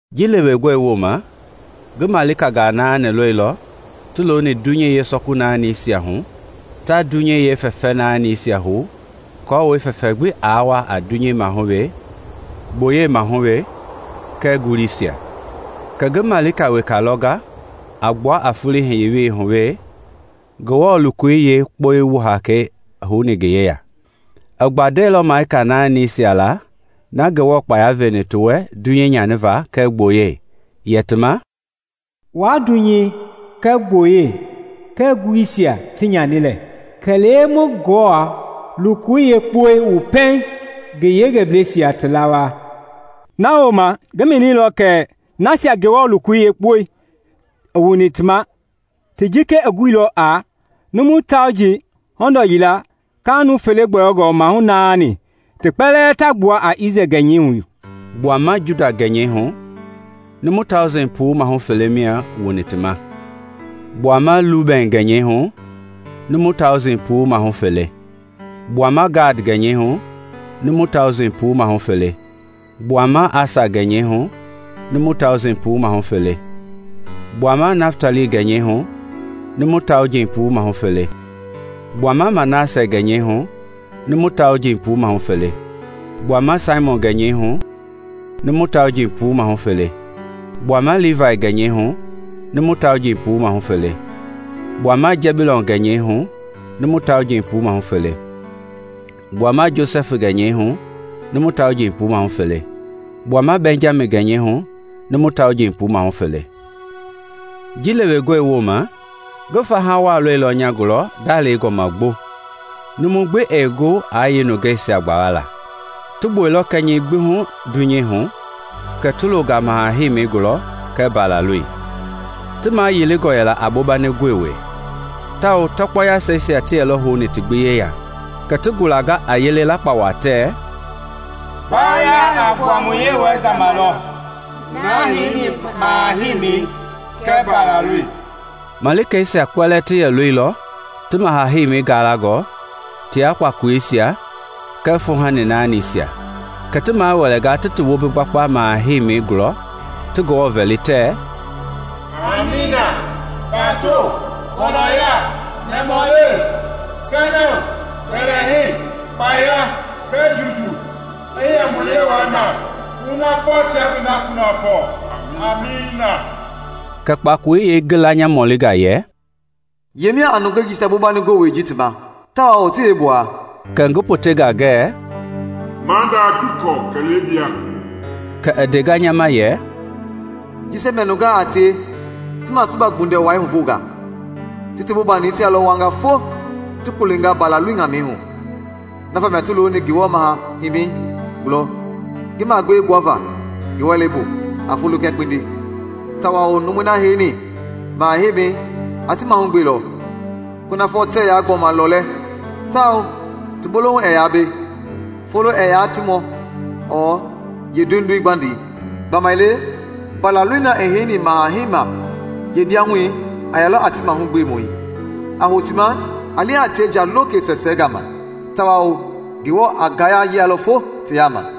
Ji lewengɔ woma, ngi malikangaa naani lɔilɔ ti looni dunyei yeesɔku naanisia hu ta dunyei yeefɛfɛ naanisia huhou aako fɛfɛ gbi aa wa a dunyei hu we, gboyei maahu we kɛɛ nguluisia. Kɛ ngi malika weka lɔnga a gbua a foloi hiye welei hu we, Ngewɔ lokoi yeekpɔ wu hakei houni ngi yeya. I gbandɛilɔ malika naanisia la Ngewɔ kpaya veni ti wɛ dunyei nyani va kɛɛ gboyei. Yɛ ti ma, “Waa dunyei kɛɛ gboyei kɛɛ nguluisia ti nyani lɛ kɛ lee ma Ngewɔ lokoi yeekpɔi wu pɛiŋ ngi yengebleisia ti lawaa.” Na wooma ngi mɛnilɔ kɛ nasia Ngewɔ lokoi yeekpɔi wuni ti ma ti jika guilɔ a: numu tauji hɔndɔ yia kalɛ nuu fele gbɔyɔngɔ mahu naani, ti kpɛlɛɛ ta gbua Isrɛel gɛnyɛi hu. Gbuama Juda gɛnyɛi hu, numu taujii mahu puu mahu fele mia wuni ti ma. Gbuama Lubɛn gɛnyɛi hu, numu tauji mahu puu mahu fele. Gbuama Gad gɛnyɛi hu, numu tauji mahu puu mahu fele. Gbuama Asa gɛnyɛi hu, numu tauji mahu puu mahu fele. Gbuama Naftali gɛnyɛi hu, numu tauji mahu puu mahu fele. Gbuama Manasɛ gɛnyɛi, numu tauji mahu puu mahu fele. Gbuama Simiɔn gɛnyɛi hu, numu tauji mahu puu mahu fele. Gbuama Livai gɛnyɛi hu, numu tauji mahu puu mahu fele. Gbuama Jɛbulɔn gɛnyɛi hu, numu tauji mahu puu mahu fele. Gbuama Josɛfi gɛnyɛi hu, numu tauji mahu puu mahu fele, kɛɛ gbuama Bɛnjami gɛnyɛi hu, numu tauji mahu puu mahu fele. Ji lewengɔe woma, ngi fahawa lɔilɔ nya gulɔ ndalewengɔ ma gbo -- numu gbii yɛ gu aa yeenungeisia gbawala. Ti gbuɛilɔ kɛnyɛi gbi hu dunyei hu kɛ ti loonga maha heimi gɔɔbu kɛɛ Mbalaloi. Ti mayilingɔ yɛla a bombani gowei, tawao tɔkpɔ yaseisia ti yɛlɔ houni ti gbi yeya. Kɛ ti gulanga a yele lakpawa tɛ: Mbawoya a gbua mu Yewɔɛi gama lɔ, na heini maha-heimɛi, kɛɛ Mbalaloi! Malikeisia kpɛlɛɛ ti yɛ looilɔ ti maha heimi galangɔ tia kpakoleisia kɛɛ fuuhani naanisia. Kɛ ti mawɛlɛnga ti ti wombisia gbakpa maha-heimɛi gulɔ ti Ngewɔ vɛli, tɛ, “Amiina! Tato, gɔlɔya, nɛmahulewe, sɛnɛwo, mbɛlɛhei, kpaya, kɛɛ juujuu i yɛ mu Yewɔɛi ma kunafɔ ta ngi da kunafɔ! Amiina!” Kɛ kpakoloi yeengila nya mɔlinga yɛ, “Yemia a nungei jisia bombani gowei ji ti ma, tawao ti yeegbuaa?” Kɛ ngi potenga ngɛ, “Maada, ngii kɔ kɛ lee bia.” Kɛ i ndea nya ma yɛ, “Jisia mia nungaa a tie ti masuba gbundɛwai huvonga. Ti ti bombanisia lɔ wuanga fo ti kolenga Mbalaloi ŋamɛi hu. Na vamia ti looni Ngewɔ maha heimi gulɔ ngi magbee gbuava ngi wɛleibu a folo kɛɛ kpindi. Tawao numui na heini Maha heimi a ti mahugbelɔ. Kunafɔ tɛɛ yaa gbɔma lɔɔlɛ tawao ti bolohu ɛɛ yaa be. Folo ɛɛ yaa ti mɔ ɔɔ yee duinduin gbandi; gbamaile Mbalaloi na i heini maha heima yeendiahu a yɛlɔ a ti mahugbemɔi, a hou ti ma a li a tie nja loke sɛɛsɛɛ gama. Tawao Ngewɔ a ngaya yialɔ fo ti yaama.”